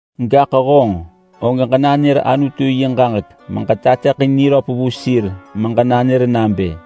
Gaḳ honġ, og ġenanër Anutu yi ġaġek meġetateḳin niröp vu sir meġenanër nabë: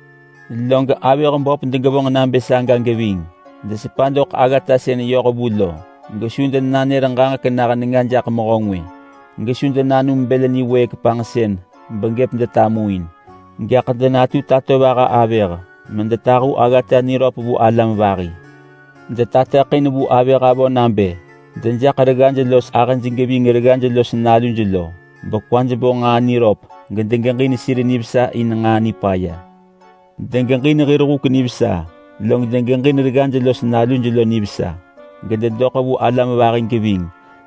Log avëh böp degevonġ nabë saga geving. Desepa doḳ aggata sën yoh vu lo, gesu denanër ġaġek nah nenga jaḳ mehö ngwë, gesu denanum bël niwëëk panġsën begëp denatumin. Gaḳ denatu tatovaha avëh medetahu aggata niröp vu alam vahi. Detateḳin vu avëh avö nabë dejaḳ reggaj log ahëj geving reggaj los naluj lo, bekwaj bo nġaa niröp gedegeġin sir nivesa in nġaa nipaya. Degeġin hir huk nivesa log degeġin reggaj los naluj lo nivesa, gededoḳ vu alam vahi geving,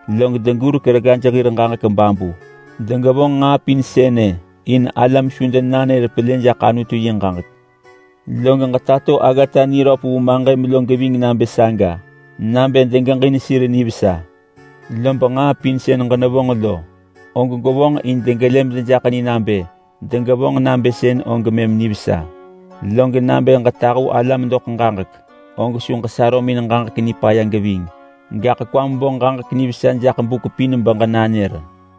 log degurek reggaj hir ġaġek babu. Degevonġ nġaa pin sënë in alam su denanër pelë jaḳ Anutu yi ġaġek. Log ġetato aggata niröp vu maġëm lo geving nabë saga, nabë degeġin sir nivesa. Lob nġaa pin sën ġenevonġ lo, og gwevonġ in degelë medejaḳ ni nabë degevonġ nabë sënë og mëm nivesa. Log nabë ġetahu alam doḳ ġaġek, og su ġesarömin ġaġek nipaya geving. Gaḳ kwam bo ġaġek nivesa jaḳ buk pin beġenanër.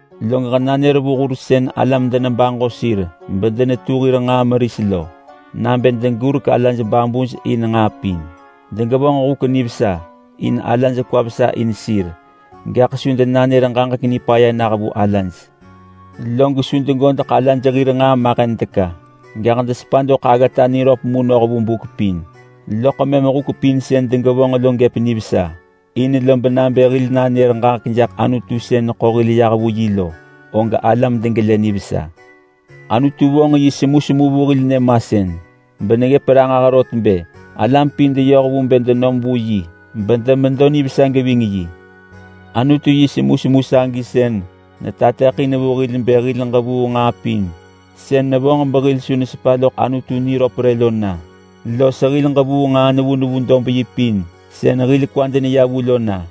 Log ġenanër vu hur sën alam denebaġo sir bedenetu hir nġaa meris lo nabë degurek alaj babuj in nġaa pin. Degevonġ huk nivesa in alaj kwaj vesa in sir, gaḳ su denanër ġaġek nipaya nah vu alaj. Log su degodeḳ alaj hir nġaa mahen teka, gaḳ desepa doḳ aggata niröp mu noh vu buk pin. Loḳ mëm huk pin sën degevonġ lo gëp nivesa, in lob nabë hil nanër ġaġek jaḳ Anutu sën neḳo hil yah vu yi lo, og alam degelë nivesa. Anutu vong yi semusemu vu hil nyëmasën beneggëp ranġah rot bë alam pin deyoh vu bë denom vu yi bedemedo nivesa geving yi. Anutu yi semusemu sagi sën netateḳin vu hil bë hil ġevuu nġaa pin sën nevonġ behil su nesepa loḳ Anutu niröp rë lo na; los hil ġevuu nġaa nevu nevu dob yi pin sën hil kwad neya vu lo na.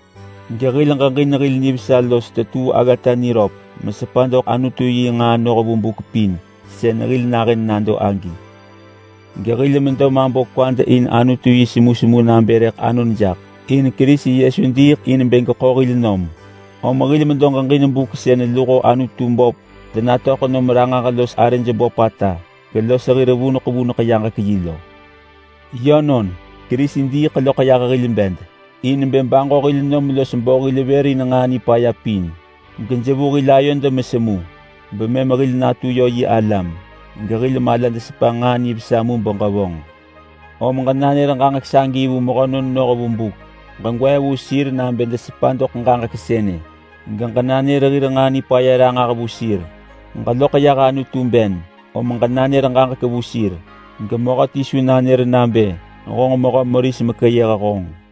Gehil ġeġin hil nivesa los tetuu aggata niröp mesepa doḳ Anutu yi nġaa noh vu buk pin sën hil nahën nado agi. Gehil medo mabo kwad in Anutu yi semusemu nabë rëḳ anon jaḳ. In Kerisi Yesu diiḳ in bë geḳo hil nom. Om hil medo geġin buk sën luho Anutu böp denatöḳ nom ranġah los arëj böpata gelos hir vuneḳ vuneḳ yaġek-yi lo. Yönon, Kerisi diiḳ loḳ yah hil bed in bë baġo hil nom los bo hil vër in nġaa nipaya pin, gejevu hil ayod mesemu. Bemëm hil natu yö yi alam, gehil malad sepa nġaa nivesa mu beġevonġ. Om ġenanër ġaġek sagi vu mehönon noh vu buk. Ġegwee vu sir nabë desepa doḳ ġaġek sënë, geġenanër hir nġaa nipaya ranġah vu sir. Ġeloḳ yah Anutu ben, om ġenanër ġaġek vu sir, gemehöti su nanër nabë honġ mehö meris mekeyëh honġ.